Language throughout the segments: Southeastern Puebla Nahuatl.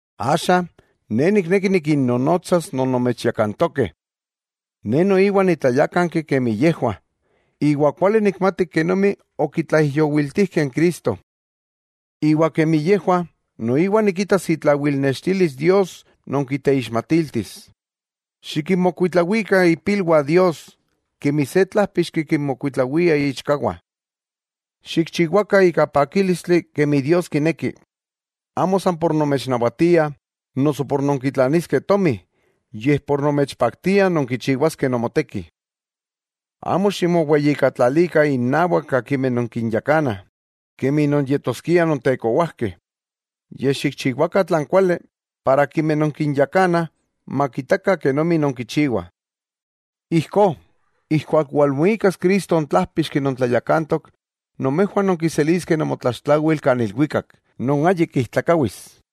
Axa, ne nikneki nikinnonotsas non nomechyakantokeh. Ne noiwa nitlayákanki kemi yejwah, iwa kuali nikmati kenomi okitlaijyowiltijkeh n Cristo. Iwa kemi yejwah noiwa nikitas itlawilnextilis Dios non kiteixmatiltis: Xikinmokuitlawikah ipilwah Dios, kemi se tlájpixki kinmokuitlawia iichkawah. Xikchiwakah ika pakílistli, kemi Dios kineki. Amo san por nomechnawatiah noso por nonkitlaniskeh tomi, yej por nomechpaktia nonkichiwaskeh nomoteki. Amo ximoweyijkatlalikah innawak akimeh nonkinyakanah, kemi non yetoskiah nontekowajkeh, yej xikchiwakah tlan kuali, para akimeh nonkinyakanah, makitakah kenomi nonkichiwah. Ijkó, ijkuak walmuikas Cristo n Tlájpixki non tlayakantok, nomejwah nonkiseliskeh nomotlaxtlawil kan ilwikak, non ayik ijtlakawis.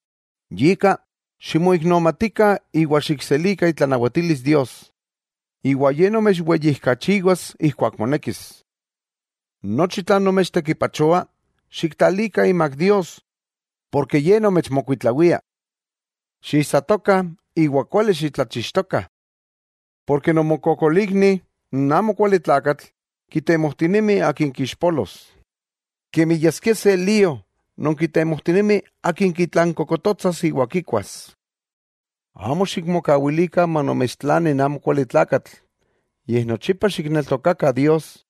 Yika, ximoiknomatikah iwa xikselikah itlanawatilis Dios, iwa Ye nomechweyijkachiwas ijkuak monekis. Nochi tlan nomechtekipachoah, xiktlalikah imak Dios, porke Ye nomechmokuitlawia. Xiisatokah iwa kuali xitlachixtokah. Porke nomokokolikni n amokualitlakatl kitemojtinemi akin kixpolos, kemi yaskia se lío non kitemojtinemi akin kitlankokototsas iwa kikuas. Amo xikmokawilikah manomechtlani n amokualitlakatl, yej nochipa xikneltokakah Dios.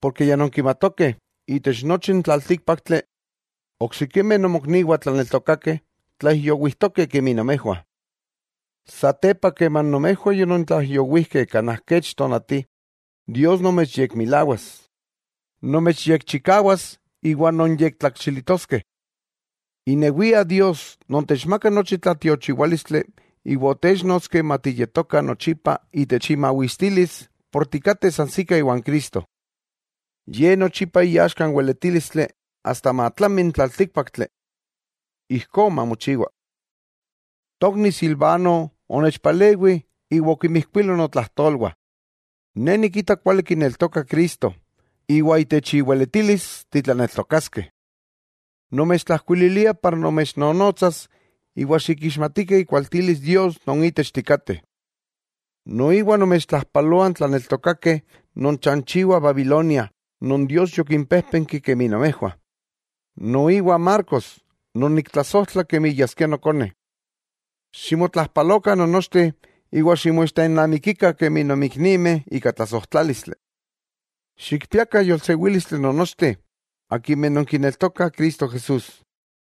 Porke ya nonkimatokeh itech nochi n tlaltíkpaktli, oksikimeh nomokniwah tlaneltokakeh tlaijyowijtokeh kemi nomejwah. Satepa keman nomejwah yonontlaijyowijkeh kanaj kech tonati, Dios nomechyekmilawas, nomechyekchikawas iwa nonyektlakxilitoskeh. Inewia Dios non techmaka nochi tlatiochiwálistli iwa otéchnotski matiyetoka nochipa itech imawistilis por tikateh sansikah iwan Cristo. ¡Ye nochipa iaxka n weletílistli, asta matlami n tlaltikpaktli! Ijkó mamochiwa. Tokni Silvano onechpalewi iwa okimijkuilo notlajtolwah. Ne nikita kuali kineltoka Cristo, iwa itech iweletilis titlaneltokaskeh. Nomechtlajkuililia para nomechnonotsas iwa xikixmatikah ikualtilis Dios non itech tikateh. Noiwa nomechtlajpaloah n tlaneltokakeh non chanchiwah Babilonia, non Dios yokinpéjpenki kemi nomejwah, noiwa Marcos, non niktlasojtla kemi yaskia nokone. Ximotlajpalokah non nochteh iwa ximoixtennamikikah kemi nonmiknimeh ika tlasojtlálistli. Xikpiakah yolsewílistli nonnochteh akimeh nonkineltokah Cristo Jesús.